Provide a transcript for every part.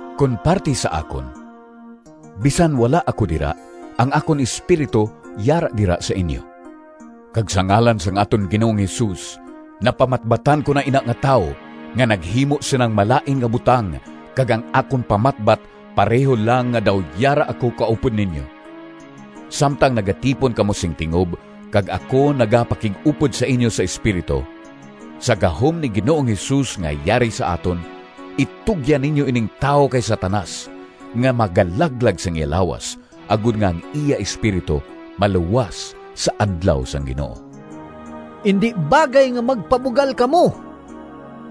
Kon parti sa akon, bisan wala ako dira, ang akon espiritu yara dira sa inyo. Kag sa ngalan sang aton Ginoong Jesus napamatbatan ko na ina nga tawo nga naghimo sinang malain nga butang kag ang akon pamatbat pareho lang nga daw yara ako kaupod ninyo. Samtang nagatipon kamo sing tingob, kag ako nagapakig-upod sa inyo sa espiritu, sa gahom ni Ginoong Jesus nga yari sa aton, itugyan ninyo ining tawo kay Satanas nga magalaglag sang iya lawas, agod nga ang iya espiritu maluwas sa Adlaw sang Ginoo. Indi bagay nga magpabugal kamo!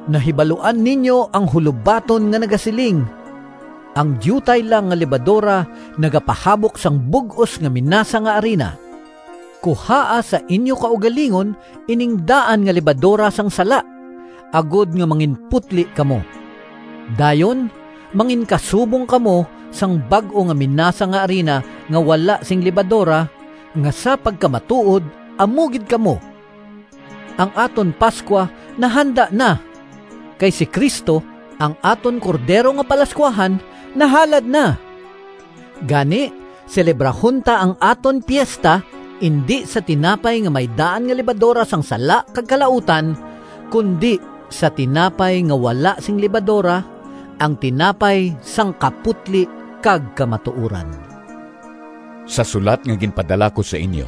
Nahibaluan ninyo ang hulobaton nga nagasiling, “Ang diutay lang nga lebadora nagapahabok sang bug-os nga minasa nga arina.” Kuhaa sa inyo kaugalingon ining daan nga lebadora sang sala, agod nga manginputli kamo. Dayon manginkasubong kamo sang bag-o nga minasa nga arina nga wala sing lebadora, nga sa pagkamatuod amo gid kamo. Ang aton Pascua nahanda na, kay si Cristo, ang aton cordero nga palascuahan nahalad na. Gani, selebrahon ta ang aton piesta, indi sa tinapay nga may daan nga lebadora sang sala kag kalautan, kundi sa tinapay nga wala sing lebadora, ang tinapay sang kaputli kag kamatuoran. Sa sulat nga ginpadala ko sa inyo,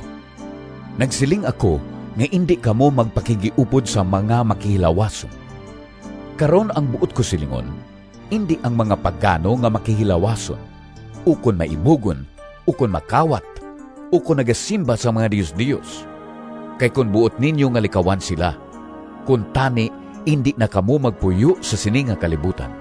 nagsiling ako nga indi kamo magpakighiupod sa mga makihilawason. Karon ang buot ko silingon, indi ang mga pagano nga makihilawason, ukon maibugon, ukon makawat, ukon nagasimba sa mga diosdios. Kay kon buot ninyo nga likawan sila, kuntani indi na kamo magpuyo sa sini nga kalibutan!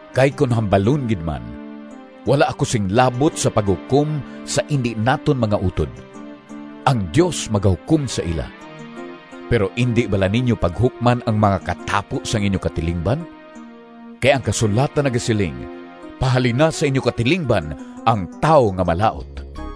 Kay kon hambalon gid man, wala ako sing labot sa paghukom sa indi naton mga utod. Ang Dios magahukom sa ila. Pero indi bala ninyo paghukman ang mga katapo sang inyo katilingban? Kay ang kasulatan nagasiling, “Pahalina sa inyo katilingban ang tawo nga malaut.”